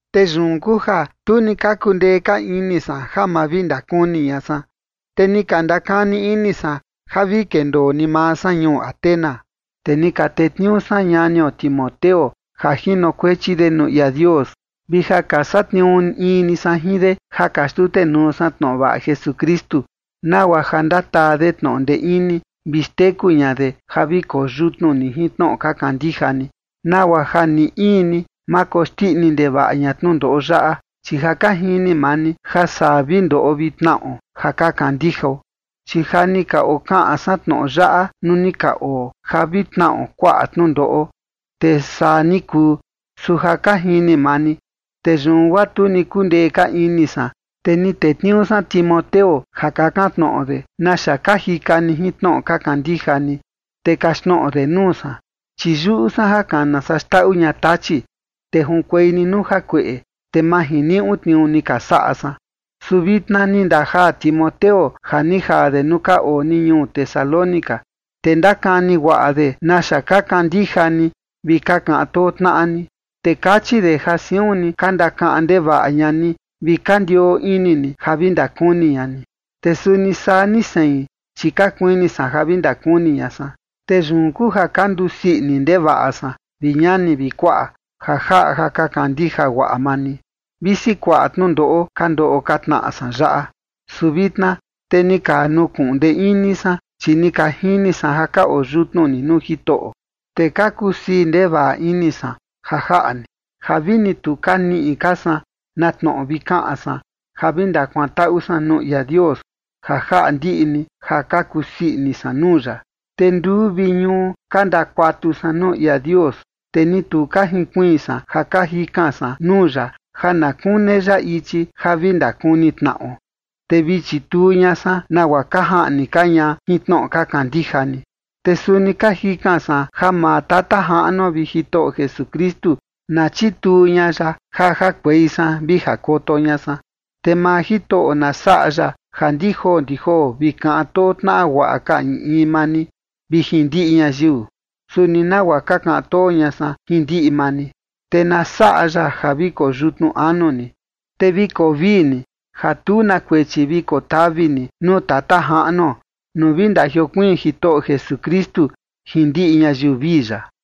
Te yun kuu ja tu ni ka kundee ka ini san ja ma vi ndakuni ña san, te ni ka ndakani ini san ja vi kendoo ni maa san ñuu Atenas. Te ni ka tetniuu san ñanio Timoteo ja jinokuechi de nuu ia Dios, vi ja ka satniuu in ni san jin de ja ka xtutenuu san tnoꞌo vaꞌa Jesukristu, nagua ja ndataa de tnoꞌo ndee ini vi xteku ña de ja vi koyutnu ni jin tnoꞌo ka kandija ni, nagua ja ni in ni ma koxndiꞌi ndevaꞌa ña tnundoꞌo yaꞌa, chi ja ka jini maa ni ja saa vi ndoꞌo vi tnaꞌo ja ka kandijao. Chi ja ni ka okaꞌan san tnoꞌo yaꞌa nuu ni ka oo, ja vi tnaꞌo kuaꞌa tnundoꞌo, te saa ni kuu, su ja ka jini maa ni. Te yun guaa tu ni kundee ka ini san, te ni tetniuu san Timoteo ja kakan tnoꞌo de naxa ka jika ni jin tnoꞌo ka kandija ni, te kaxtnoꞌo de nuu san, chi yuꞌu san ja kana saa xndaꞌu ña Tachi, te junkuei ni nuu jakueꞌe, te ma jiniuꞌu tniuu ni ka saꞌa san. Su vitna ni ndajaa Timoteo ja ni jaa de nuu ka oo ni ñuu Tesalónica, te ndakani guaꞌa de naxa ka kandija ni vi ka kaꞌan too tnaꞌa ni. Te kachi de ja siun ni ka ndakaꞌan ndevaꞌa ña ni vi ka ndioo ini ni ja vi ndakuni ña ni. Te suni saa ni sein, chi ka kuini san ja vi ndakuni ña san. Te yun kuu ja ka ndusii ini ndevaꞌa san, vi ñani vi kuaꞌa, ja jaꞌa ja ka kandija guaꞌa maa ni, visi kuaꞌa tnundoꞌo ka ndoꞌo ka tnaꞌa san yaꞌa. Su vitna te ni ka nukuꞌun ndee ini san, chi ni ka jini san ja ka oo yutnu ni nuu Jitoꞌo. Te ka kusii ndevaꞌa ini san ja jaꞌa ni, ja vini tu ka niꞌi ka san na tnoꞌo vi kaꞌan san ja vi ndakuantaꞌu san nuu ia Dios ja jaꞌa ndiꞌi ni ja ka kusii ini san nuu ya. Te nduu vi ñuu ka ndakuatu san nuu ia Dios, te ni tu ka jinkuiin san ja ka jikan san nuu ya ja na kune ya ichi ja vi ndakuni tnaꞌo, te vi chituu ña san nagua ka jaꞌni ka ña jin tnoꞌo ka kandija ni. Te suni ka jikan san ja maa Tata Jaꞌnuo vi Jitoꞌo Jesukristu na chituu ña ya ja jakuei san vi jakoto ña san. Te maa Jitoꞌo na saꞌa ya ja ndi joo ndi joo vi kaꞌan too tnaꞌa guaꞌa ka in in maa ni vi jin ndiꞌi ñayiu, suni nagua ka kaꞌan too ña san jin ndiꞌi maa ni. Te na saꞌa ya ja vi koo yutnu anu ni, te vi koo vii ni ja tu na kuechi vi kotavi ni nuu Tata Jaꞌnuo nuu vi ndajiokuiin Jitoꞌo Jesukristu jin ndiꞌi ñayiu vii ya.